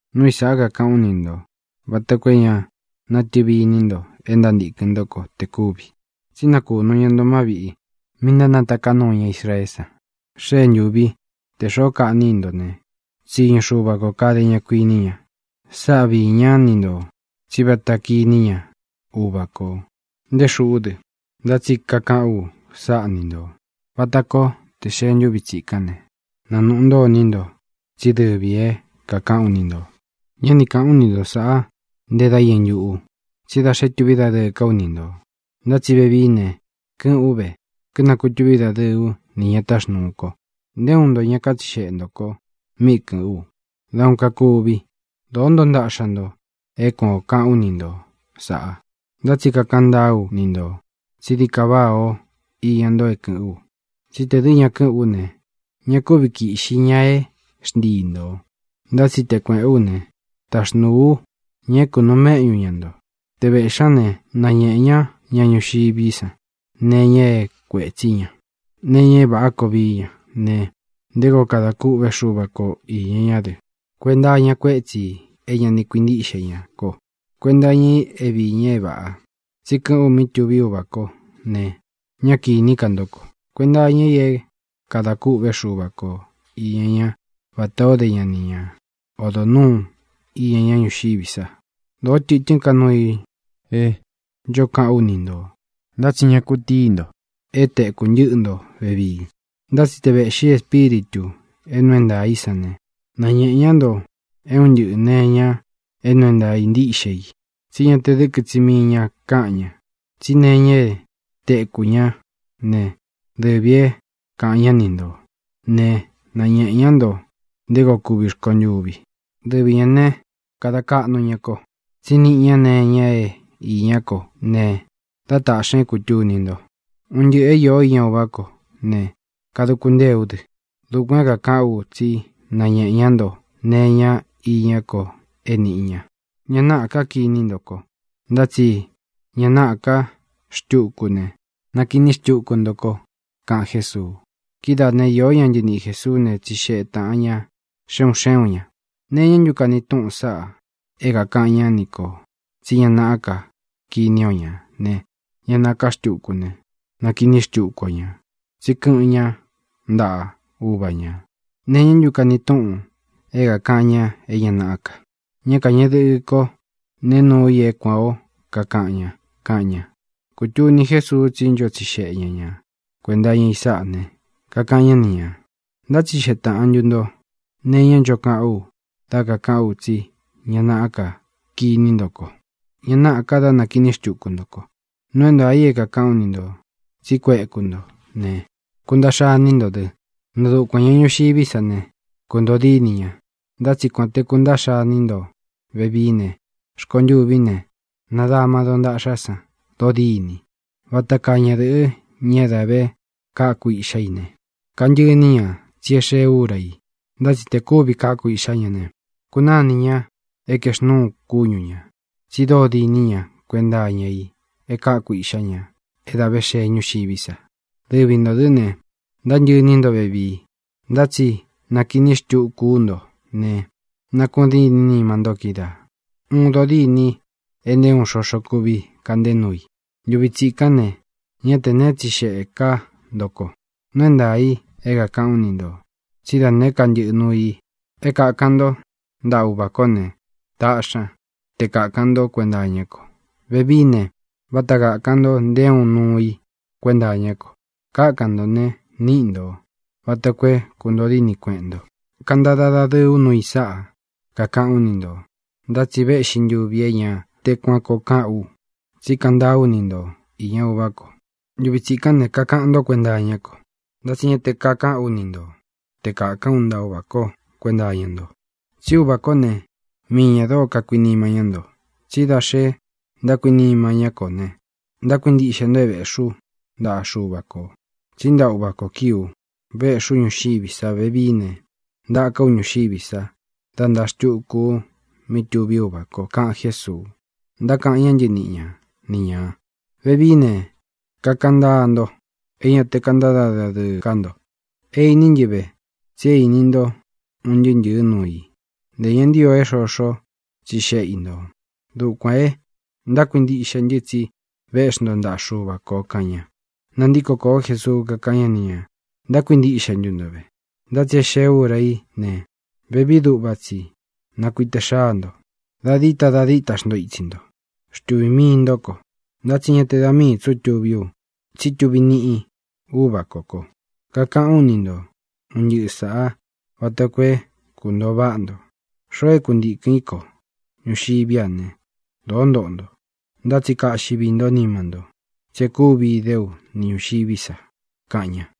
ʼNúu i sāꞌá kakaꞌán u ni ntō vata koo é ña natɨvi iní nto e ntántīkɨn ntó ko te kúvi. Tsí nakunu ña nto má viꞌī mí ntánataká nuu ña Israeé san. Xée ntūvi te xoó kaꞌní i nto ne, tsiñu Xuva kō kade ña, kuiní ña. Sáꞌa viī ñá ni ntō tsí vata kiní ña Uvā kó, nté xūꞌú dɨ. Ntá tsi kakaꞌán u sáꞌa ni ntō vata koo tē xee ntúvi tsīkán ne, nanuꞌu ntó iní nto tsí dɨvī é kākaꞌán u ni ntō. ʼÑá ni kāꞌán u ni nto sāꞌá nte dá iñɨ ntuꞌu, tsí da xé tuví dadɨɨ ká u ni ntō. Ntá tsi vevií ne, kɨ́ꞌɨ̄n ú ve, kínakutúvi dadɨɨ ú nī ña táxnūu ko. Nté uun nto ña kátsixeꞌe ntō ko mí kɨ̄ꞌɨ́n u. Da uun kakuvi, dōó ntoo ntaꞌxa nto é kuan ō kaꞌán u ni nto sāꞌa. Ntá tsi kakaꞌan ntáa ú ni ntō tsí dií ka váꞌā o íña nto é kɨ̄ꞌɨ́n u. Tsí tē dɨ́ ña kɨ́ꞌɨn ú ne, ña kúvi kīꞌxi ña é xntii ntō. Ntá tsi te kuēꞌén u ne, taxnūu ú ña é kunuu méꞌñu ña ntō. Te vēꞌxí ña ne, nañeꞌe ñá ña ñuxiví san nee iña é kuētsí ña, nee iña é vāꞌá koo vií ña ne, nté koo kada kúꞌve Xúva ko īña ña dɨ: kuenta iña kuétsi ī é ña ni kuintíꞌxe ña ko; kuenta iña i é viī ña é vāꞌa, tsi kɨ́ꞌɨ̄n u mí tuví Uvā kó ne, ñá kīní ka ntó ko; kuenta iña i é kadā kûꞌvé Xuva ko īña ñá vatā o dé ña ni ña odo nūú iña ñá ñuxiví sa. ʼDōó tɨtɨ́n ka nuu i é ncho kaꞌán u ni ntō, ntá tsi ña kutíi nto é tēku ntɨ́ꞌɨ nto vevii. Ntá tsi te vēꞌxi Espíritū é nuu é ntaā í san ne, nañēꞌe ñá nto é un ntɨꞌɨ̄ nee iña é nuu é ntāa ntíꞌxe i. Tsi ñá te dɨ̄kɨ tsi mii ña káꞌan ña, tsí nee iña é tekū ñá ne, dɨvī é kaꞌan ñá ni nto ne, nañēꞌe ña nto nté koo kuvi rkontûvi. Dɨvi ñā né, kada kaꞌnu ña ko, tsí niꞌi ña nee iña e iñá ko ne dá taꞌxī ña é kūtuni nto. Un ntɨꞌɨ̄ é īó iña Uvá ko ne, kaduku ntée ú dɨ. Dukuān é kākaꞌán u tsí nañēꞌe ñá nto nee iña iñá ko é nīꞌi ña. ʼÑa náꞌā ká kiní nto ko, ntá tsi ña naꞌá ka xtúku ne, nakiní xtuku nto ko —kaꞌan Jésuu. Kidáā ne, iō ñá ntɨniꞌi Jēsuú ne, tsixeꞌe tāꞌan ña xe un xé un ñā: —¿Nee iñá ntu kani túꞌun sáꞌa é kākaꞌan ñá ni kō tsí ña naꞌá ka kiní o ñā ne, ña náꞌā ká xtuku ne, nakiní xtuku o ñā, tsí kɨꞌɨn ñá ntaꞌa Uva ñā? ¿Nee iñá ntu kani túꞌun é kākaꞌan ña é ña naꞌá ka? Ñá kāñeꞌe dɨkɨ kó ne nuu i é kuān ó kakaꞌan ña —kaꞌan ña. Kūtuni Jésuu tsí ncho tsixeꞌe ña ña kuenta iña i sáꞌa ne, kakaꞌan ñá ni ñā: —¿Ntátsixeꞌe taꞌan ntu ntō nee iñá ncho kaꞌán u dā kaꞌán u tsí ña naꞌá ka kiní nto ko, ña náꞌā ka dá nakīní xtuku nto ko? Nuu é ntaā i é kākaꞌán u ni ntō tsi kuéku nto ne, kuntaꞌxa iní nto dɨ, nɨɨ̄ dukuan ña ñuxiví san ne, kuntoo dínī ña. Ntá tsi kuān te kuntaꞌxa iní nto vevií ne, rkontûví ne, nadama dontaꞌxá san dodîni. Vata kaa ñadɨ̄ꞌɨ, ña é dā vé kaku iꞌxá i ne, kantɨꞌɨ iní ña tsí e xee úra i. Ntá tsi tē kúvī káku iꞌxá ña ne, kunánī ñá e kaexnúu kúñu ña, tsi dóo diní ña kuenta iña i e káku iꞌxá ña é dā vé xee ñúxiví sa. Dɨvi ntō dɨ́ ne, ntántɨꞌɨ iní nto vevii. Ntá tsi nakiní xtuku ú nto ne, nakuꞌun dîní nima ntó kídaā, uun dodîni e nté uun xoxo kuvi kaꞌnté nuu i. ʼNtuvi tsikán ne, ñá tē neé tsixeꞌē ká nto ko. Nuu é ntaā i é kākaꞌán u ni ntō tsí da nēé ka ntɨꞌɨ nuu i é kākan ntó ntaꞌa Uvā kó ne, taꞌxi ña te kākan ntó kuenta iñá ko. Vevií ne, váta kākan nto nté uun nuu i kuenta iñá ko. Kákan ntō ne, níꞌi ntō, vata koo é kūntoo díni kueꞌen nto. ʼKantada dadɨɨ ú nuu i sáꞌa, kakaꞌán u ni ntō. Ntá tsi véꞌxī ntuvi é ña te kuan koo kaꞌán ka u, tsí kaꞌan ntáa ú ni nto īña Uvá ko. Ntuvi tsikán ne, kákan nto kuenta iñá ko. Ntá tsi ña te kakaꞌán u ni ntō te kākán u ntaꞌa Uvā kó kuenta iña nto. Tsi Úvā kó ne, mii ñā dóo kakuinima ñá nto, tsí da xe ntákuinima ntó ko ne, ntákuintiꞌxe nto é vēꞌxi ú ntaꞌa Xuva kō. Tsí ntaꞌa Uvā ko kíi ú, véꞌxī ú ñuxiví sa. Vevií ne, ntaka ú ñuxiví sa dá ntāa xtuku u mí tuví Uvā ko —kaꞌan Jésuu. Ntákaꞌan ñá ntɨniꞌi ña ni ñā: —Vevií ne, kakaꞌan ntáa nto, é ña te kántada dadɨɨ ká nto. É īní ntɨ ve tsi íni nto un ntɨɨ́ ntɨ̄ɨ núu i. Ntē ña ntio é xoxo tsixéꞌe i ntō. Dukuān e ntákuintiꞌxe ntɨ tsi véꞌxi nto ntaꞌa Xuva kō —kaꞌan ña. Nantíko kōó Jesuu, kakáꞌan ñá ni ñā: —¿Ntákuintiꞌxe ntu nto ve? Ntá tsi e xée ūra í ne, vevií duꞌva tsi nakuite xáa nto. Da díta da díta xnto itsi nto, xtuvī mii ntó ko. Ntá tsi ña te da mii tsí u tuví u, tsí tuvi niꞌi Úvā kó ko. Kakaꞌán u ni nto un ntɨꞌɨ sāꞌá vata koo é kūntoo váꞌa nto, xoo é kantīkɨn í ko. Ñuxiví a ne, dōó ntoꞌo nto. Ntá tsi kaꞌxi vií nto nima ntó, tsi e kúvi idé u ni ñūxiví sa —kaꞌan ña.